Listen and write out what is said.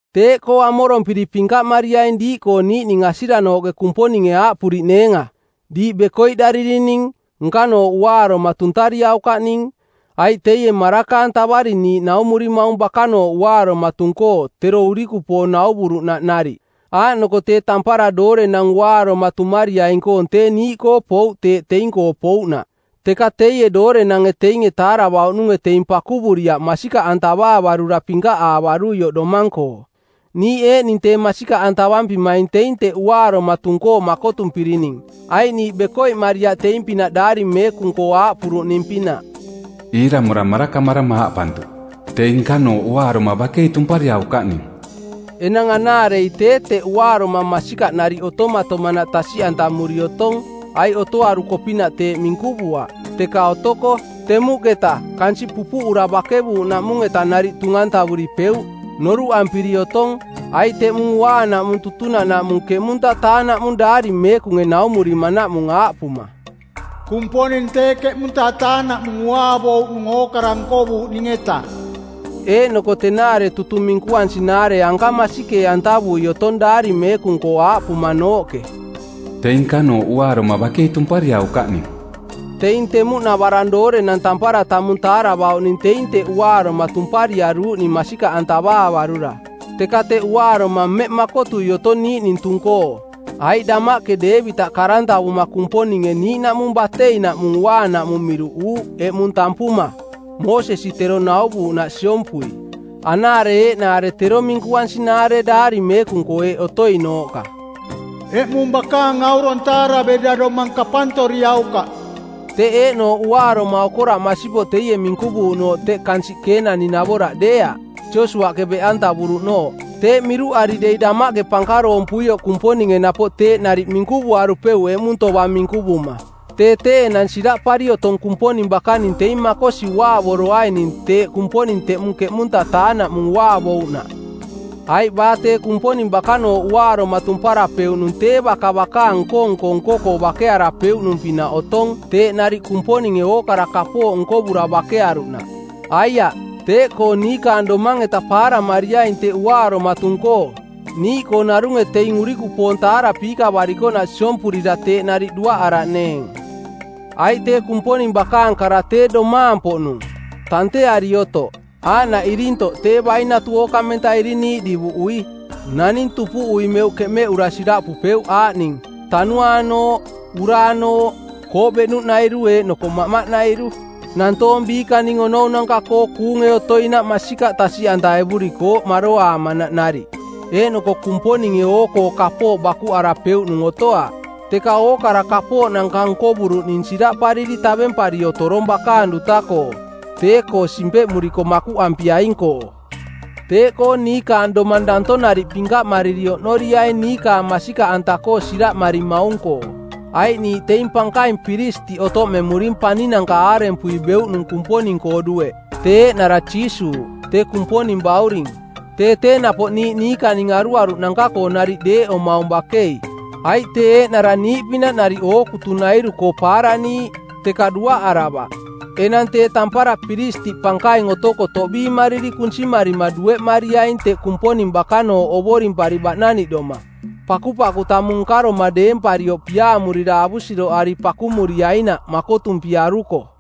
Teeꞌkoo amorompiri pinkaꞌmariaing diiꞌkoo niiꞌning asiranooꞌke Kumponinge aaꞌpuriꞌneenga, “Diiꞌ bekoiꞌdaririning, nkanooꞌ uaaroma tuntariaukaꞌning.” Aiꞌ teie maraka-antavari niiꞌ naumurimaung bakanooꞌ uaaroma tung-koo tero urikupoong nauvuruꞌnaꞌ nariꞌ. Aaꞌnoko tee tampara doorenang uaaroma tumariaing-koong tee niiꞌkoo pouꞌ teeꞌ teing-koo pouꞌnaꞌ, teka teie doorenange teinge taaravauꞌnunge teing pakuvuriaꞌ masikaꞌantavaavarura pinkaꞌaavaruioꞌ domang-koo. Niiꞌ eeꞌning tee masikaꞌantavampimaing teing teꞌ uaaroma tung-koo makotumpirining, aiꞌ niiꞌ bekoiꞌmariaꞌ teing-pinaꞌ daari meekung-koo aaꞌpuruꞌning-pinaꞌ, “Iiramora marakamarama aaꞌpantuꞌ, ‘Teing nkanooꞌ uaaroma bakei tumpariaukaꞌning.’” Enang anaarei tee teꞌ uaaroma masikaꞌ nariꞌ otomatomanaꞌ tasiꞌantamuri otong aiꞌ otoaruko-pinaꞌ teeꞌ minkuvuaꞌ, teka otoko, temuꞌketa, kansiꞌ pupuꞌura bakevuuꞌnaꞌmung-eta nariꞌ tung-antavuripeuꞌ. Noruꞌampiri otong, aiꞌ teꞌmung uaanaꞌmung tutunaꞌnaꞌmung ˜keꞌmunta-taa-naꞌmung daari meekunge naumurimanaꞌmung aaꞌpuma, “Kumponing tee ˜keꞌmunta-taa-naꞌmung uaavouꞌnung ookara nkovuuꞌning-eta.” Eeꞌnoko tenaare tutung minkuansinaare anka masikee-antavui otong daari meekung-koo aaꞌpumanooꞌke, “Teing nkanooꞌ uaaroma bakei tumpariaukaꞌning.” Teing temuꞌnavarang doorenang tampara tamung taaravauꞌning teing teꞌ uaaroma tumpariaruuꞌning masikaꞌantavaavarura. Teka teꞌ uaaroma mmeꞌ makotui otong niiꞌning tung-koo. Aiꞌ damaꞌke Deevitaꞌ karantavuma˜ Kumponinge niiꞌnaꞌmung bateinaꞌmung uaanaꞌ mung miruꞌuuꞌ “eꞌmung” tampuma, Moosesi tero nauvuuꞌnaꞌ siompui. Anaare eeꞌnaare tero minkuansinaare daari meekung-koo eeꞌ otoinooꞌka, “Eꞌmung bakaang aurong taaraverira domang kapantoriaukaꞌ.” Teꞌ eeꞌnooꞌ uaaroma okoraꞌ masipoꞌ teie minkuvuuꞌnooꞌ teꞌ kansiꞌ Keenani-navoraꞌ deeaꞌ, Josiuaꞌke beꞌantavuruꞌnooꞌ. Teeꞌ miruꞌari dei damaꞌke pankaroompuioꞌ Kumponinge napoꞌ teeꞌ nariꞌ minkuvuarupeuꞌ “eꞌmung” tovang minkuvuma. Tee tee enang siraꞌpari otong Kumponing bakaning teing makosi uaavoroaining teeꞌ Kumponing teꞌmung ˜keꞌmunta-taa-naꞌmung uaavouꞌnaꞌ. Aiꞌ baa tee Kumponing bakanooꞌ uaaroma tumparapeuꞌnung tee baka bakaang nko-nko nko-koo bakearapeuꞌnung-pinaꞌ otong teeꞌ nariꞌ Kumponinge ookara kapooꞌ nkovura bakearuꞌnaꞌ. Aiaꞌ, teeꞌkoo niikaang domang-eta paaramariaing teꞌ uaaroma tung-koo niiꞌkoo narunge teing urikupoong taarapiikavarikoꞌnaꞌ siompurira teeꞌ nariꞌ duaꞌaraꞌneeng. Aiꞌ tee Kumponing bakaang kara tee domaang-poꞌnung, tanteari otoꞌ, aaꞌnaꞌ irintoꞌ tee bainatu ookamenta iriniiꞌ divuꞌui. Naning tupuꞌui meuꞌ keꞌmeꞌura siraꞌpupeuꞌ aaꞌning: tanuaanooꞌ, uraanooꞌ, kooꞌ beꞌnuꞌnairu eeꞌnoko maꞌmaꞌnairu. Nantoong biikaning onounanka-koo kuunge otoinaꞌ masikaꞌ tasiꞌantaevurikooꞌ maroaamanaꞌ nariꞌ. Eeꞌnoko Kumponinge oo-koo kapooꞌ bakuꞌarapeuꞌnung otoaꞌ, teka ookara kapooꞌnanka nkovuruꞌning siraꞌpariri tavempari otorong bakaang duta-koo, tee-koo simpeꞌmuriko makuꞌampiaing-koo. Teeꞌkoo niikaang domang danto nariꞌ pinkaꞌmariri oꞌnoriaing niikaang masikaꞌanta-koo siraꞌmarimaung-koo, aiꞌ niiꞌ teing pankaing piristiꞌ otoꞌmemuring paninanka aarempui beuꞌnung Kumponing-koo dueꞌ, tee eeꞌnara Jiisuuꞌ, tee Kumponing Bauring. Tee tee napoꞌ niiꞌ niikaning aruaruꞌnanka-koo nariꞌ deeꞌomaung bakei, aiꞌ tee eeꞌnara niiꞌpinaꞌ nariꞌ ookutunairu-koo paaraniiꞌ, teka duaꞌaravaꞌ. Enang tee tampara piristiꞌ pankaing otoko toꞌbiimariri kunsimarima dueꞌmariaing teꞌ Kumponing bakanooꞌ ovorimpari baꞌnaniꞌdoma, pakupaku tamung nkaroma deemparioꞌ piaamurira avusiroꞌari pakumuriainaꞌ makotumpiaruko.